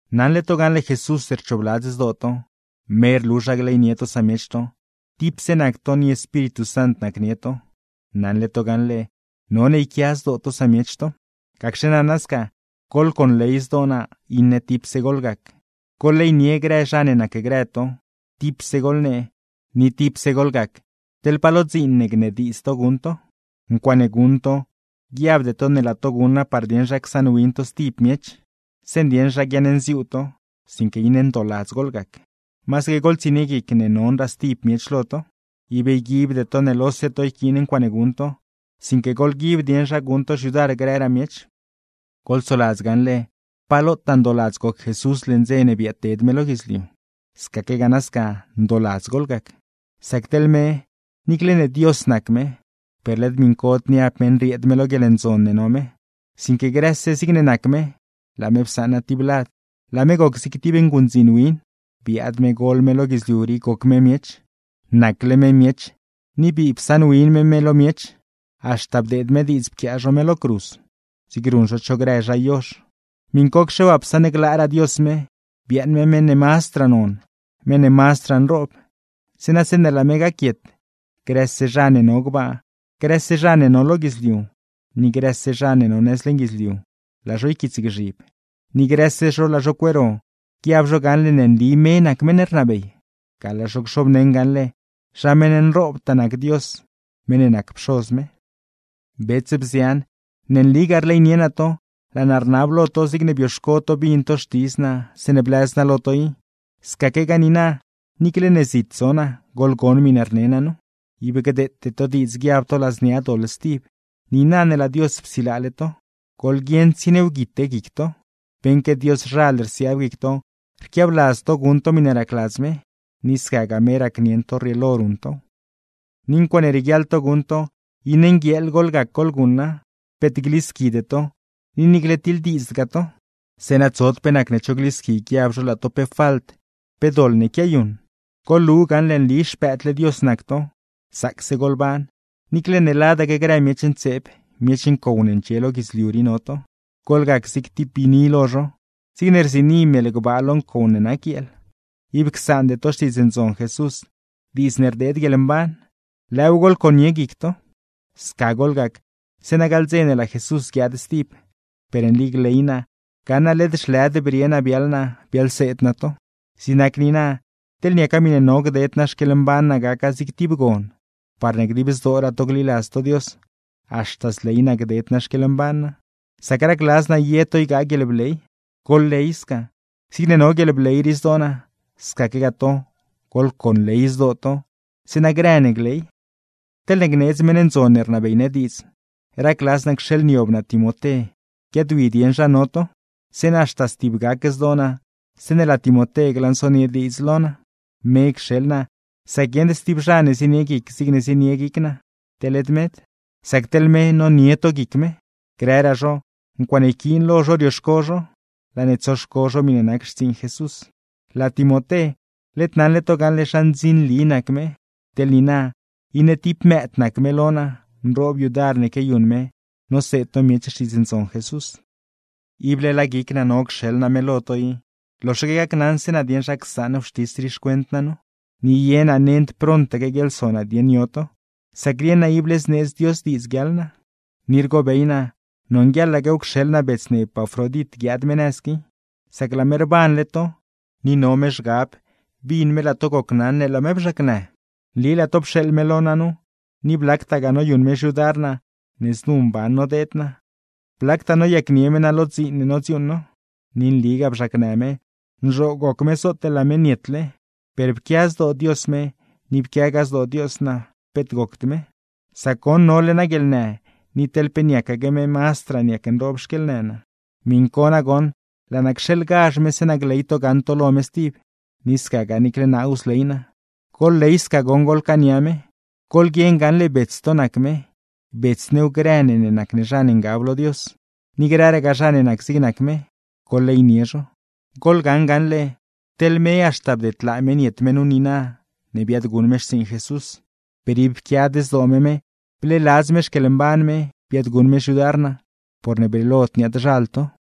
Naṉle to gaṉle Jesús rchoobladz zdoo to, me rlu zha gleynie to samiech to, tipse nac to ni Espíritu Sant nacnie to; naṉle to gaṉle none yquia zdoo to samiech to. Gacxe nana sca, goḻconley zdoo naa, iṉe tipse goḻgac, goḻleynie grë zha ne nacgrë to, tipse goḻnee, ni tipse goḻgac teḻ pa lo dziin ne gnediidz to guṉ to. Ncuaaṉe guṉ to, guiabde to ne laa to guṉa par dieṉ zha csaṉwin to stib miech, zeeṉ dieṉ zha guiaṉnziuu to; sinque iṉe ndooladz goḻgac, masaque goḻtsienie guic ne nonraa stib miech lo to. Ib yguibde to ne lose to yquiin ncuaaṉe guṉ to, sinque goḻguib dieṉ zha guṉ to xyudar grëraa miech. Goḻsoladz gaṉle pa lotaa ndooladz goc Jesús leṉ dze ne biaadted me lo guidzliu, scaquegaa nasca ndooladz goḻgac. Sac teḻ me: Niicle ne Dios nac me, per led miṉcod niab me nrieed me lo guieḻndzon ne no me, sinque grëse zigne nac me, laa me psaṉa tib lad, laa me goc zig tib nguṉdziin win, biaad me gol me lo guidzliu rii goc me miech. Nacle me miech, ni bii psaṉwin me me lo miech, haxta bdeed me diidz pquiaa zho me lo cruz, zig ruṉ zho cho grë zha yozh. Miṉcocxe waa, psaṉglaaraa Dios me, biaaṉ me meṉ ne mazdraa non, meṉ ne mazdraa nroob; zeeṉa zeeṉe laa me gaquiet, grëse zha ne no gbaa, grëse zha ne no lo guidzliu, ni grëse zha ne no nëz leṉ guidzliu, laa zho yquiitsgzhib, ni grëse zho laa zho cueero, guiab zho gaṉle ne nli me nac meṉ ne rnabey. Ga laa zho cxobneṉ gaṉle, zha meṉ nroobtaa nac Dios, meṉ ne nac Pxoz me. Bets, bzian, ne nligaa rleynie naa to. Laa naa rnab lo to (zigne bioxco to bin to xtidz naa zeeṉe blëz naa lo to i, scaquegaa niina niicle ne zit zo naa, goḻgon miṉe rne naa nu), ib gdeete to diidz guiab to ladznia doḻ stib, niina ne laa Dios psilaale to; goḻguieṉ tsieniewguite guic to. Beṉque Dioszhal rsiaab guic to rquiabladz to guṉ to miṉe racladz me, ni scagaa me racnieṉ to rrieelo ruṉ tow. Ni ncuaaṉe rieguiaḻ to guṉ to, iṉe nguieeḻ goḻgac goḻguṉa, peet glisquide to, ni niicle tiḻdiidzdgaa to; zeeṉa tsod pe nacne cho glisqui guiab zho laa to pe falt, pe doḻ ne quiayuṉ. Goḻlu gaṉle nli xpëëdle Dios nac to; zaacse goḻban, niicle ne ladaque grë miech ntseeb, miech ncow ne ndxie lo guidzliu rii no to. Goḻgac zig tib biini lo zho, zigne rziini mel gbaa lo ncow ne nac guieel. Ib csaande to Xtiidz Ndzon Jesús, diidz ne rdeed guieḻmban, lëëw goḻconie guic to. Sca goḻgac, zeeṉa gaḻ dze ne laa Jesús guiaad stib, per nli gley naa gaṉ naa led zhlëd brie naa biaḻ naa, biaḻseed naa to. Zig nac niina, teḻ niaca miṉe no gded naa xquieḻmban naa gaca zig tib gon, parne dib zdooraa to gliladz to Dios, haxta zley naa gded naa xquieḻmban naa; sac racladz naa ye to ygaa guieḻbley. ¡Goḻley sca! Zigne no guieḻbley rii zdoo naa, scaquegaa to goḻco nley zdoo to, zeeṉa grë ne gley. Teḻne gneedz meṉ ndzon ne rnabey ne diidz, racladz naa cxeeḻniob naa Timoté guiaadwi dieṉ zha no to, zeeṉa haxta stibgac zdoo naa zeeṉe laa Timoté glansonie diidz lo naa. Me cxeḻ naa, sac guieṉd stib zha ne zienie guic zig zienie guic naa, teḻ led med; sac teḻ me nonie to guic me. Grëraa zho, ncuaaṉe yquiin lo zho rioxco zho, laa ne tsoxco zho miṉe nac xtsiiṉ Jesús. Laa Timoté, led naṉle to gaṉle zha ndzinli nac me, teḻ niina iṉe tib mëëd nac me lo naa, nroob yudar ne quiayuṉ me noseed no miech Xtiidz Ndzon Jesús. Ible laa guic naa no cxeḻ naa me lo to i, loxaque gacnaṉse naa dieṉ zha csaṉ wxtis rii xcuent naa nu. Ni ye naa nend prontaque guiaḻso naa i dieṉ yo to, sac rieṉ naa ible zneedz Dios diidz guiaḻ naa. Ni rgobey naa nonguieḻaquew cxeḻ naa bets ne Epafrodit guiaad me nëz qui, sac laa me rbanle to, ni no me zhgab bin me laa to gocnaṉ ne laa me bzhaacnë. Nli laa to pxeeḻ me lo naa nu, ni blactagaa noyuṉ me xyudar naa ne znu mban nodeed naa, blactaa noyacnie me naa lo dziin ne nodziuuṉ no. Ni nligaa bzhaacnë me, nzhoo goc me zootle laa me nietle; per pquia zdoo Dios me ni pquiaagaa zdoo Dios naa peet gocd me, sac goṉ nole naa guieḻnë, ni teḻ pe niacaque me mazdraa niac nroob xquieḻnë naa. Miṉ co nagoṉ laa naa cxeḻgazh me, zeeṉa gley to gaṉ to lo me stib, ni scagaa niicle naaw zley naa. Goḻley sca goṉ goḻcaania me, goḻguieṉ gaṉle bets to nac me, bets new grë ne ne nac ne zha ne ngab lo Dios; ni grëragaa zha ne nac zig nac me, goḻleynie zho. Goḻgaṉ gaṉle, teḻ me haxta bdedlaa me niet me nu niina ne biaadguṉ me xtsiiṉ Jesús; per ib pquiad zdoo me me, bleeladz me xquieḻmban me biaadguṉ me xyudar naa, porne brieelod niaad-zhal to.